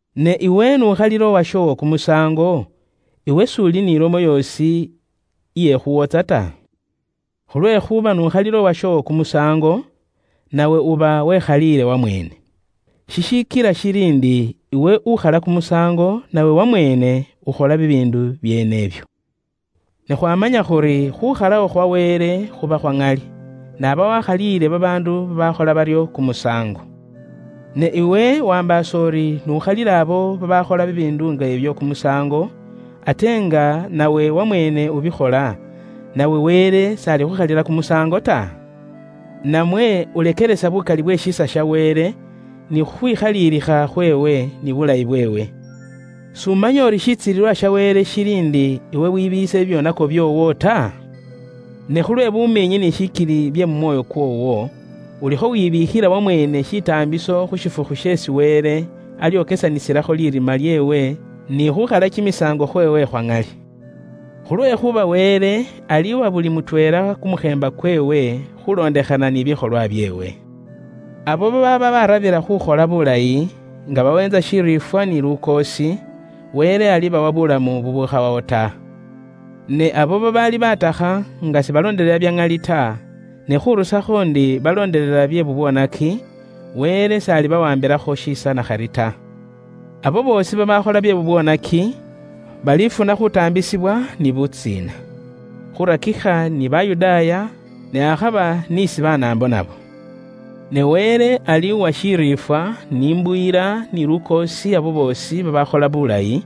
Ne iwe n'ukhalila uwashoowo kumusaango, iwe s'uli n'ilomo yoosi iye khuuwotsa ta? Khulwekhuuba n'ukhalila uwashoowo kumusaango, nawe uba wekhaliile wamweene. Shishikila shili ndi iwe ukhala kumusaango nawe wamweene ukhola bibiindu byeene ibyo. Ne khwaamanya khuri khuukhalawo khwa Wele khuba khwa ŋali, n'aba waakhaliile babaandu babaakhola baryo kumusaango. Ne iwe waambaasa uri n'ukhalila abo babaakhola bibiindu nga ibyo kumusaango, ate nga nawe wamweene ubikhola, nawe Wele s'alikhukhalila kumusaango ta? Namwe ulekelesa bukali bwe shiisa sha Wele, ni khukhwikhaliilikha khweewe, ni bulayi bweewe? S'umanya uri shitsilililwa sha Wele shili ndi iwe wibiiyise bibyoonako byoowo ta? Ne khulwe bumiinyi ni shikili bye kumwoyo kwoowo, ulikho wibiikhila wamweene shitaambiso khu shifukhu sheesi Wele alyokesanisilakho lirima lyeewe, ni khuukhala kimisaango khweewe khwa ŋali. Khulwekhuuba Wele aliiwa buli mutweela kumukheemba kweewe, khuulondekhana ni bikholwa byeewe. Abo babaaba baarabila khuukhola buulayi, nga baweentsa shiriifwa ni lukoosi, Wele alibawa buulamu bubukhawawo ta. Ne abo babaali baatakha nga sibaloondelela bya ŋali ta, ne khurusakho ndi baloondelela bye bubwoonaki, Wele s'alibawaambilakho shiisa nakhari ta. Umuundu yeesi ukhola bye bubwoonaki, alifuna khutaambisibwa ni butsiina, khurakikha ni Bayudaaya, ne akhaba ni isi Banaambo nabo. Ne Wele aliiwa shiriifwa, n'imbuyila, ni lukoosi abo boosi babaakhola buulayi,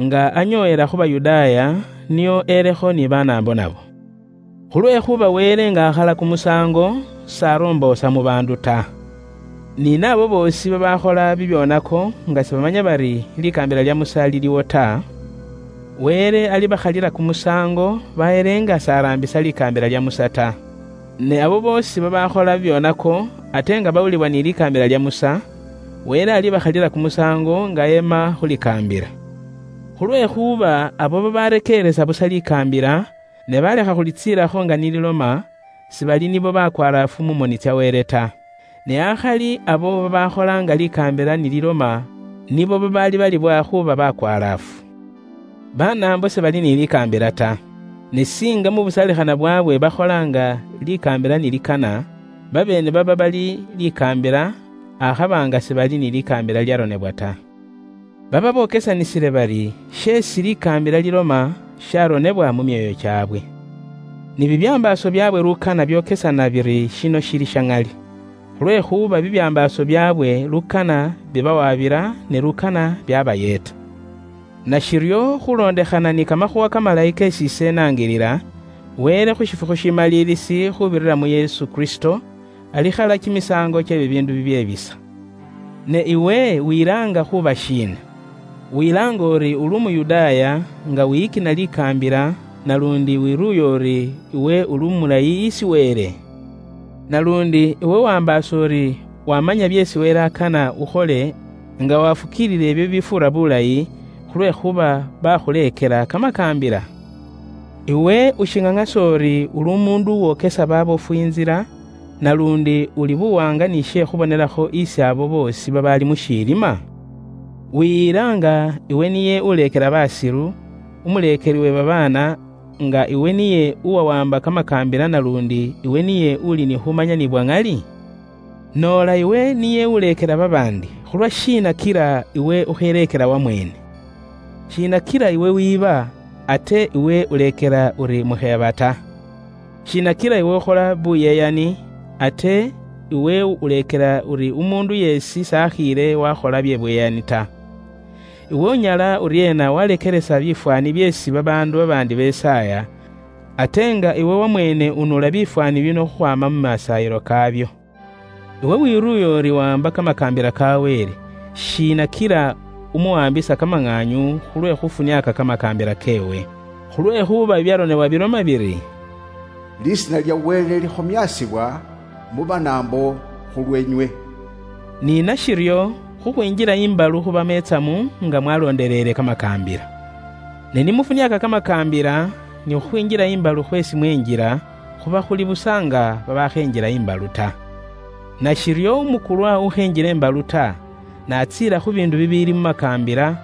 nga anyoowela khu Bayudaaya, nio elekho ni Banaambo nabo. Khulwekhuuba Wele nga akhala kumusaango, s'aromboosa mu baandu ta. Ni naabo boosi babaakhola bibyoonako nga sibamanya bari likaambila lya Musa liliwo ta, Wele alibakhalila kumusaango bahele nga s'araambisa likaambila lya Musa ta. Ne abo boosi babaakhola bibyoonako ate nga bawulibwa ni likaambila lya Musa, Wele alibakhalila kumusaango nga ema khu likaambila. Khulwekhuuba abo babarekeeresa busa likaambila ne baalekha khulitsiilakho nga ni liloma, sibali nibo bakwalaafu mu moni tsya Wele ta. Ne akhali abo babaakhola nga likaambila ni liloma nibo babaabalibwa khuuba bakwalaafu. Banaambo sibali ni likaambila ta. Ne singa mu busaalikhana bwaabwe bakhola nga likaambila ni likana, babeene baba bali likaambila, akhaba nga sibali ni likaambila lilyaronebwa ta. Baba bokesanisile bari sheesi likaambila liloma sharonebwa mu myoyo kyaabwe. Ni bibyambaaso byaabwe lukana byokesana biri shino shili sha ŋali. Khulwekhuuba bibyambaaso byaabwe lukana bibawabila, ne lukana byaabayeeta. Nashiryo khuulondekhana ni kamakhuuwa kamalayi keesi ise inaangilila, Wele khu shifukhu shimaliilisi khuubirira mu Yesu Kristo, alikhala kimisaango kye bibiindu bibyebisa. Ne iwe wilaanga khuuba shiina? Wilaanga uri uli Umuyudaaya nga wiyikina likaambila naluundi wiruuya uri iwe uli umulayi isi Wele? Naluundi iwe waambaasa uri waamanya byeesi Wele akana ukhole nga waafukiilila ibyo bibifuura buulayi, khulwekhuuba bakhuleekela kamakaambila? Iwe ushiŋaŋasa uri uli umuundu uwokesa baabofu intsila, naluundi uli buwaanga ni she khubonelakho isi abo boosi babaali mu shilima? Wiyila nga iwe niye uleekela baasilu, umuleekeli uwe babaana, nga iwe niye uwawaamba kamakaambila naluundi iwe niye uli ni khumanya ni bwa ŋali? Noola iwe niye uleekela babaandi, khulwashiina kila iwe ukheleekela wamweene? Shiina kila iwe wiiba, ate iwe uleekela uri mukheeba ta? Shiina kila iwe ukhola buyeyani, ate iwe uleekela uri umuundu yeesi s'akhiile waakhola bye buyeyani ta? Iwe unyala uryeena waalekelesa bifwaani byeesi babaandu babaandi besaaya, ate nga iwe wamweene unuula bifwaani bino khukhwaama mu masaayilo kaabyo? Iwe uwiruuya uri wawaamba kamakaambila ka Wele, shiina kila umuwaambisa kamaŋaanyu khulwe khufuniaaka kamakaambila keewe? Khulwekhuuba bibyaronebwa biloma biri, “Bafwotsola lisiina lya Wele mu Banaambo khulweenywe.” Ni nashiryo khukhwinjila imbalu khubamo itsamu nga mwalondeleele kamakaambila. Ne ni mufuniaaka kamakaambila, ni khukhwinjila imbalu khweesi mwenjila, khuba khuli busa nga babaakhenjila imbalu ta. Nashiryo umukulwa ukhenjila imbalu ta, n'atsiila khu biindu bibiili mu makaambila,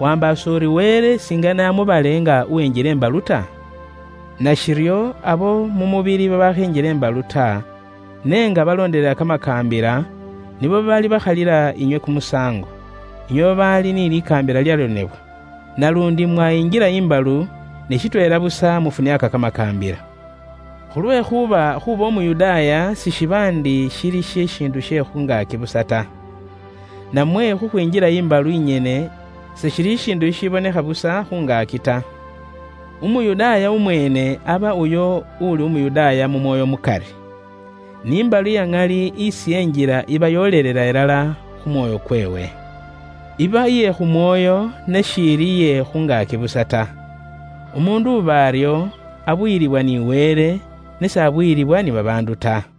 waambaasa uri Wele singane amubale nga uwenjila imbalu ta? Nashiryo abo mu mubili babaakhenjila imbalu ta, ne nga baloondelela kamakaambila, nibo babaalibakhalila inywe kumusaango, inywe babaali ni likaambila lilyaronebwa. Naluundi mwayingila imbalu, ne shitweela busa mufuniaaka kamakaambila. Khulwekhuuba khuuba Umuyudaaya sishiba ndi shili shishiindu she kumubili busa ta. Namwe khukhwinjila imbalu inyene seshili shishiindu shishibonekhela busa khungaaki ta. Umuyudaaya umweene aba uyo uuli Umuyudaaya mu mwoyo mukari. Ni imbalu iyaŋali isi enjila iba yoolela ilala khu mwoyo kweewe. Iba iye khu mwoyo, ne shiili iye khu ngaaki busa ta. Umuundu uba aryo, abuyilibwa ni Wele, ne s'abuyilibwa ni babaandu ta.